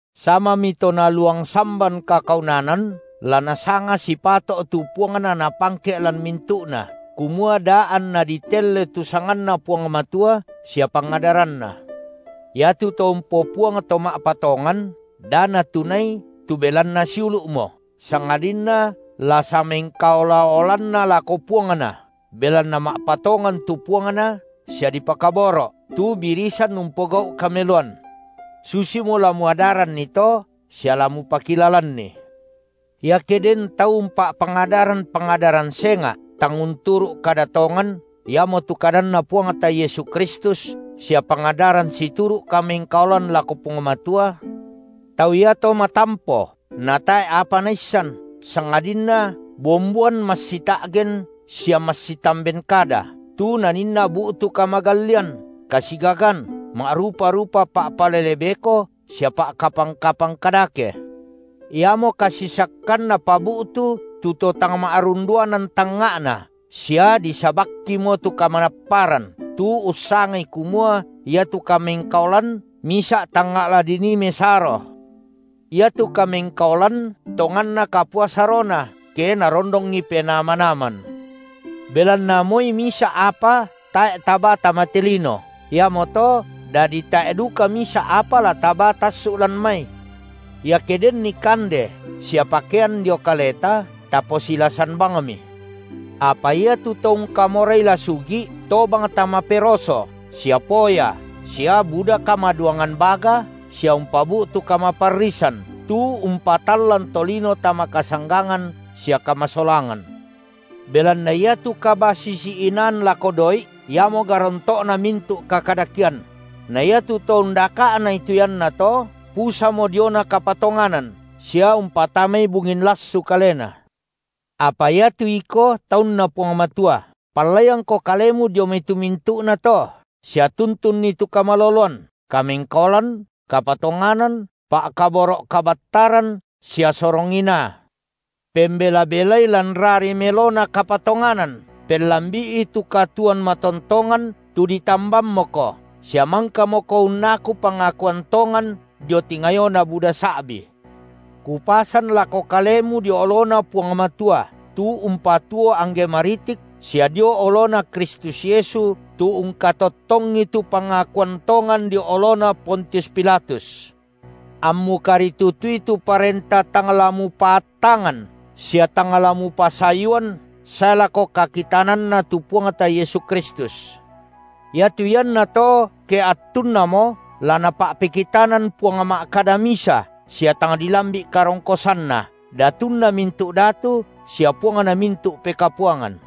Samami to naluang samban kakaunanan, la nasanga sipato’ tu puangna napangke’ lan mintu’na, kumua da anna ditelle tu sanganNa Puang Matua sia pangadaranNa. Iato to umpopuang to ma’patongan, da natunai tu belanna siulu’mo, sangadinna la samengkaola-olanna lako puangna, belanna ma’patongan tu puangna sia dipakaboro’, tu birisan umpogau’ kameloan. Susimo la muadaranni to sia la mupakilalanni. Iake den tau umpa’pangadaran pangadaran senga’, tang unturu’ kada tongan, iamotu kadanNa Puangta Yesu Kristus, sia pangadaran situru’ kamengkaolan lako Puang Matua, tau iato matampo, natae’ apa naissan, sangadinna bomboan massita’gen sia massitamben kada, tu naninna bu’tu kamagallian, kasigagan, ma’rupa-rupa pa’palele beko sia pa’kapang-kapang kadake, iamo kasisakkan napabu’tu tu to tang ma’runduanan tangnga’na sia disabakkimo tu kamanapparan, tu ussangai kumua iatu kamengkaolan misa’ tangnga’ la dinii mesaro. Iatu kamengkaolan tonganna kapua sarona, ke narondongi penaa manaman. Belanna moi misa’ apa tae’ tabaa tama te lino, iamoto dadi tae’ duka misa’ apa la tabaa tassu’ lan mai. Iake denni kande sia pakean dio kaleta, taposilasan bangmi. Apa iatu to ungkamorai la sugi’, tobang tama peroso sia poya sia buda kamaduangan baga sia umpabu’tu kamaparrisan tu umpatallan tolino tama kasanggangan sia kamasolangan. Belanna iatu kabasisi-inaan lako doi’, iamo garonto’na mintu’ kakadakean; na iatu to undaka’nai tu iannato, pusamo diona kapatonganan sia umpatamai bungin lassu kalena. Apa iatu iko, taunNa Puang Matua, pallaiangko kalemu dio mai tu mintu’nato, sia tuntunni tu kamaloloan, kamengkaolan, kapatonganan, pa’kaboro’ kabattaran sia sorong inaa. Pembela-belai lan rari melona kapatonganan, pellambi’i tu katuoan matontongan, tu ditambammoko, sia mangkamoko unnaku pangakuan tongan dio tingayona buda sa’bi. Kupasan lako kalemu dio oloNa Puang Matua, tu umpatuo angge maritik sia dio oloNa Kristus Yesu tu ungkatottongi tu pangakuan tongan dio olona Pontius Pilatus. Ammu karitutui tu parenta tang la mupaattangan sia tang la mupasayuan sae lako kakitananNa tu Puangta Yesu Kristus. Iatu iannato ke attunnamo la Napa’pekitanan Puang ma’kada misa sia tang dilambi’ karongkosanNa. Datunna mintu’ datu sia Puangna mintu’ pekapuangan.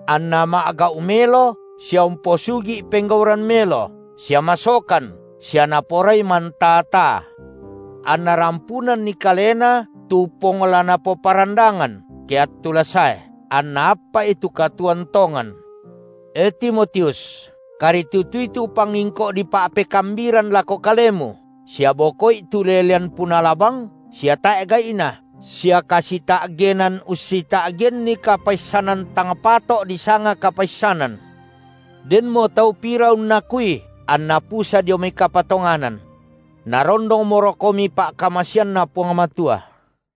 Anna ma’gau melo sia umposugi’ penggauran melo, sia masokan, sia naporai mantaa-taa, anna rampunanni kalena tu pong la napoparandangan, ke attu la sae, anna appa’i tu katuoan tongan. E Timotius, karitutui tu pangingko’ dipa’pekambiran lako kalemu, sia boko’i tu ulelean punala bang sia tae’ gai’na sia kasita’genan ussita’genni kapaissanan tang pato’ disanga kapaissanan; denmo tau pira unnakui, anna pusa dio mai kapatonganan. Narondongmorokomi pa’kamaseanNa Puang Matua.